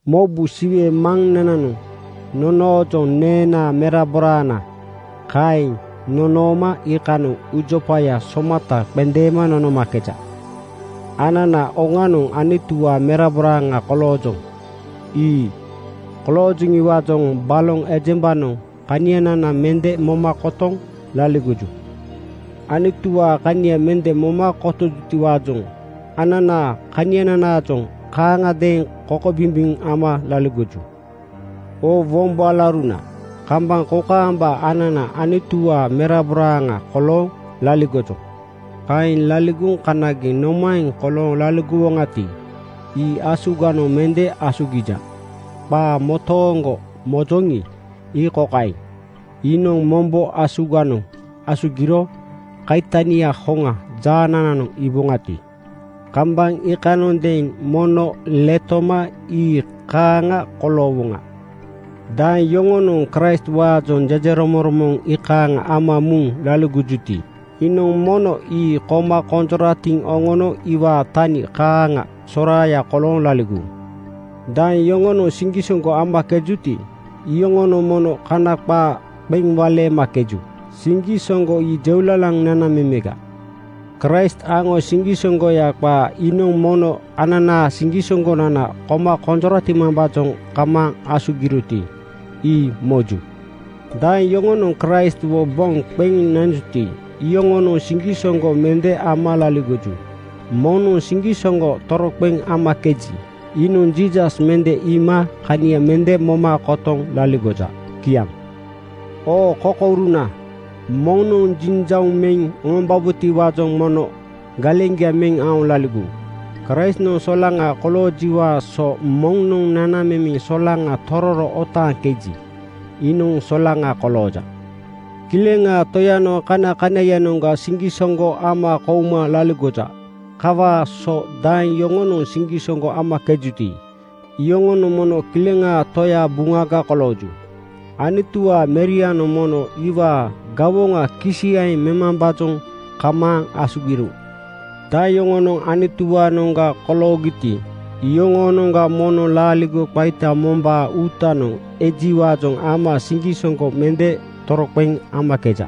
Mobu! Siwe Maŋnananoŋ nonoojoŋ “Neenaa meraboraana,” kaeŋ nonooma iikanoŋ uujopaya somata qendeema nonomakeja. Anana oŋanoŋ Anutuwaa meraboraaŋa koloojoŋ. Ii koloojoŋiwaajoŋ baloŋ ejembanoŋ kanianana mende moma kotoŋ laligoju. Anutuwaa kania mende moma kotojutiwaajoŋ ananaa kaniananaajoŋ kaaŋagadeeŋ kokobimbiŋ ama laligoju. Oo wombo alauruna, kambaŋ kokaamba anana Anutuwaa meraboraaŋa kolooŋ laligojoŋ. Kaeŋ laligoŋ kanageŋ nomaeŋ kolooŋ laligowoŋati, ii asuganoŋ mende asugija. Qaa motooŋgo mojoŋi, ii kokaeŋ: Iinoŋ mombo asuganoŋ asugiro kaitania hoŋa jaanananoŋ iiboŋati, kambaŋ iikanondeeŋ mono letoma ii kaaŋa koloowoŋa. Daeŋ yoŋonoŋ Kraistwaajoŋ jejeromoŋromoŋ iikaaŋ ama muŋ laligojuti, iinoŋ mono ii koma konjoratiŋ oŋono iwaa tani kaaŋa soraaya kolooŋ laligowu. Daeŋ yoŋonoŋ siŋgisoŋgo amakejuti, iyoŋonoŋ mono kana qaa qeŋ waleemakeju. Siŋgisoŋgo ii jeulalaŋ nanamemeŋga. Kraist aŋo siŋgisoŋgoya qaa iinoŋ mono ananaa siŋgisoŋgonana koma konjoratimambaajoŋ kamaaŋ asugiroti, ii moju. Daeŋ yoŋonoŋ Kraistwo boŋ qeŋ nanjuti, iyoŋonoŋ siŋgisoŋgo mende ama laligoju. Moŋnoŋ siŋgisoŋgo toroqeŋ amakeji, iinoŋ Jiisas mende iima kania mende moma kotoŋ laligoja. Kiaŋ. Oo kokouruna, moŋnoŋ jinjauŋ meŋ oŋombabotiwaajoŋ mono galeŋgia meŋ aoŋ laligowu. Kraistnoŋ solaŋa koloojiwaa so moŋnoŋ nanamemeŋ solaŋa tororo otaaŋkeji, iinoŋ solaŋa kolooja. Kileŋaa Toyanoŋ kanakanaiyanoŋga siŋgisoŋgo ama kouma laligoja. Kawaa so daeŋ yoŋonoŋ siŋgisoŋgo amakejuti, iyoŋonoŋ mono Kileŋaa Toyaa buŋaga kolooju. Anutuwaa Merianoŋ mono iwaa gawoŋa kisiyaeŋ memambaajoŋ kamaaŋ asugiro. Daeŋ yoŋonoŋ Anutuwaanoŋga koloogiti, iyoŋoonoŋga moŋnoŋ laaligo qaita mombaa uutanoŋ ejiwaajoŋ ama siŋgisoŋgo mende toroqeŋ amakeja.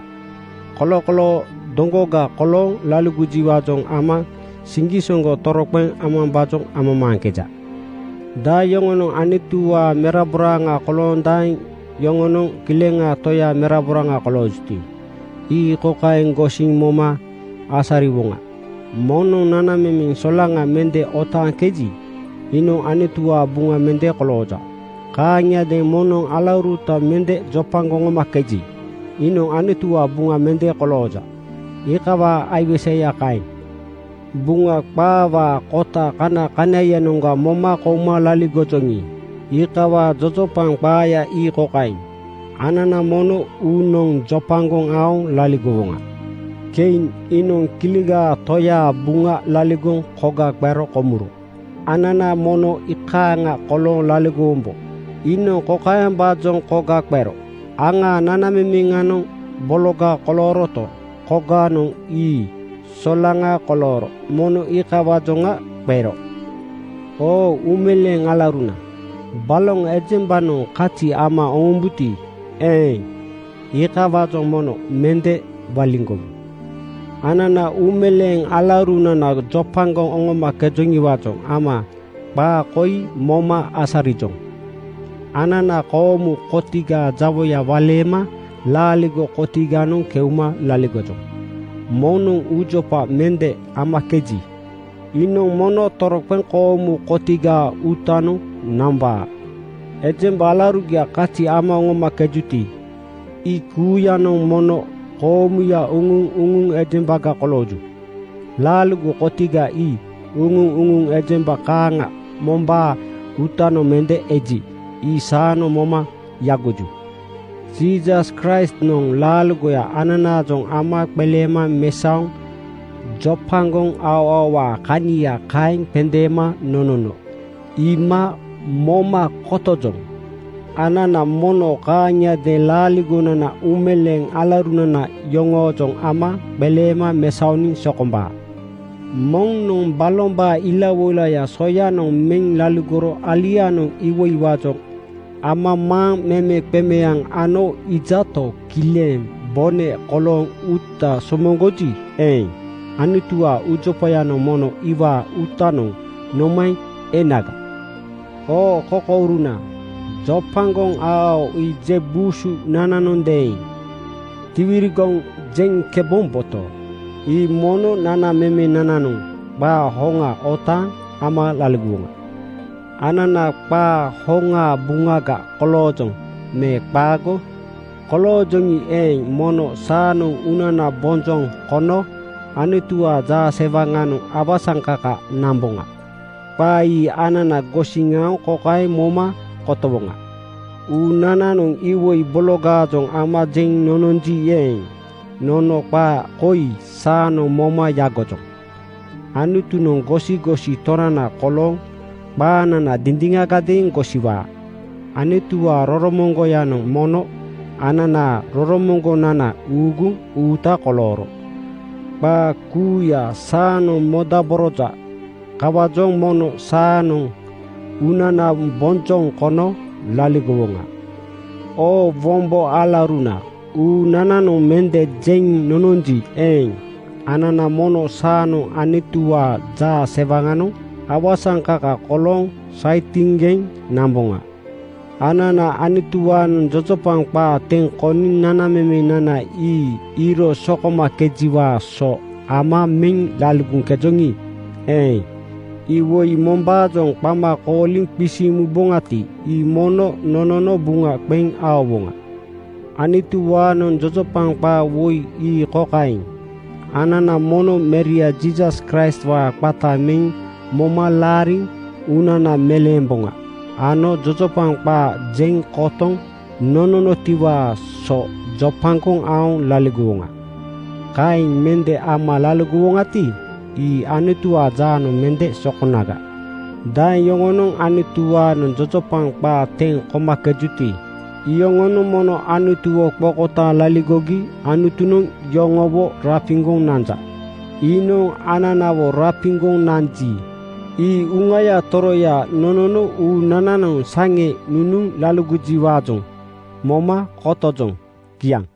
Kolokoloo doŋgoga kolooŋ laligojiwaajoŋ ama siŋgisoŋgo toroqeŋ amambaajoŋ amamaaŋkeja. Daeŋ yoŋonoŋ Anutuwaa meraboraaŋa kolooŋ daeŋ yoŋonoŋ Kilegaa Toyaa meraboraaŋa koloojuti, ii kokaeŋ gosiŋ moma asariwoŋa: Moŋnoŋ nanamemeŋ solaŋa mende otaaŋkeji, iinoŋ Anutuwaa buŋa mende kolooja. Kaaŋiadeeŋ moŋnoŋ alauruta mende jopagoŋ oŋomakeji, iinoŋ Anutuwaa buŋa mende kolooja. Iikawaa aiweseya kaeŋ. Buŋa qaawaa kota kanakanaiyanoŋga moma kouma laligojoŋi, iikawaa jojopaŋ qaaya ii kokaeŋ: Anana mono uunoŋ jopagoŋ aoŋ laligowoŋa. Kein (Kain) iinoŋ Kilegaa Toyaa buŋa laligoŋ koga qero komuro. Anana mono ii kaaŋa kolooŋ laligowombo. Iinoŋ kokaembaajoŋ koga qero: Aŋaa nanamemeŋanoŋ bologa kolooroto, kogaanoŋ ii solaŋa kolooro. Mono iikawaajoŋa qero. Oo uumeleeŋ alauruna, baloŋ ejembanoŋ kazi ama oŋombuti eeŋ, iikawaajoŋ mono mende waliŋgowu. Anana uumeleeŋ alaurunana jopagoŋ oŋomakejoŋiwaajoŋ ama qaa koi moma asarijoŋ: Anana koomu kotigaa jawoya waleema laaligo kotiganoŋ keuma laligojoŋ. Moŋnoŋ uujopa mende amakeji, iinoŋ mono toroqeŋ koomu kotigaa uutanoŋ nambaa. Ejemba alaurugia kazi ama oŋomakejuti, ii kuuyanoŋ mono koomuya uŋu-uŋu ejembaga kolooju. Laaligo kotiga ii uŋu-uŋu ejemba kaaŋa mombaa uutanoŋ mende eji, ii saanoŋ moma yagoju. Jiisas Kraistnoŋ laaligoya ananaajoŋ ama qeleema mesaoŋ jopagoŋ aoaowaa kania kaeŋ qendeema nonono iima moma kotojoŋ. Anana mono kaaŋiadeeŋ laaligonana uumeleeŋ alaurunana yoŋoojoŋ ama qeleema mesaoniŋ sokombaa. Moŋnoŋ balombaa ilawoilaya soyanoŋ meŋ laligoro alianoŋ iwoiwaajoŋ amamaaŋ memeqemeaŋ ano iijato, kileŋ bone kolooŋ uuta somoŋgoji eeŋ, Anutuwaa uujopayanoŋ mono iwaa uutanoŋ nomaeŋ enaga? Oo kokouruna, jopagoŋ aoao ii je buu susunananondeeŋ tiwirigoŋ jeŋkebomboto, ii mono nanamemenananoŋ qaa hoŋa otaaŋ ama laligowoŋa. Anana qaa hoŋaa buŋaga koloojoŋ me qaago? Koloojoŋi eeŋ, mono saanoŋ uunana bonjoŋ kono Anutuwaa jaasewaŋanoŋ awasaŋkaka namboŋa. Qaa ii anana gosiŋ aoŋ kokaeŋ moma kotowoŋa: Uunananoŋ iwoi bologaajoŋ ama jeŋ nononji eeŋ, nono qaa koi saanoŋ moma yagojoŋ: Anutunoŋ gosigosi Tonana kolooŋ qaanana dindiŋagadeeŋ gosiwaa. Anutuwaa roromoŋgoyanoŋ mono ananaa roromoŋgonana uuguŋ uuta kolooro qaa kuuya saanoŋ modaboroja. Kawaajoŋ mono saanoŋ uunana bonjoŋ kono laligowoŋa. Oo wombo alauruna, uunananoŋ mende jeŋ nononji eeŋ, anana mono saanoŋ Anutuwaa jaasewaŋanoŋ awasaŋkaka kolooŋ saitiŋgeŋ namboŋa. Anana Anutuwaanoŋ jojopaŋ qaa teŋ koniŋ nanamemenana ii iiro sokomakejiwaa so ama meŋ laligoŋkejoŋi eeŋ, iwoi mombaajoŋ qama kooliŋ qisiŋ muboŋati, ii mono nonono buŋa qeŋ aowoŋa. Anutuwaanoŋ jojopaŋ qaa woi ii kokaeŋ: Anana mono Meria Jiisas Kraistwaa qata meŋ moma laariŋ uunana meleemboŋa ano jojopaŋ qaa jeŋ kotoŋ nononotiwaa so jopagoŋ aoŋ laligowoŋa. Kaaŋ mende ama laligowonagati, ii Anutuwaa jaanoŋ mende sokonaga. Daeŋ yoŋonoŋ Anutuwaanoŋ jojopaŋ qaa teŋ komakejuti, iyoŋonoŋ mono Anutuwo qokotaaŋ laligogi Anutunoŋ yoŋowo rapiŋgoŋ nanja. Iinoŋ ananawo rapiŋgoŋ nanji, ii Uŋaya Toroya nonono uunananoŋ saŋe nunuŋ laligojiwaajoŋ moma kotojoŋ. Kiaŋ.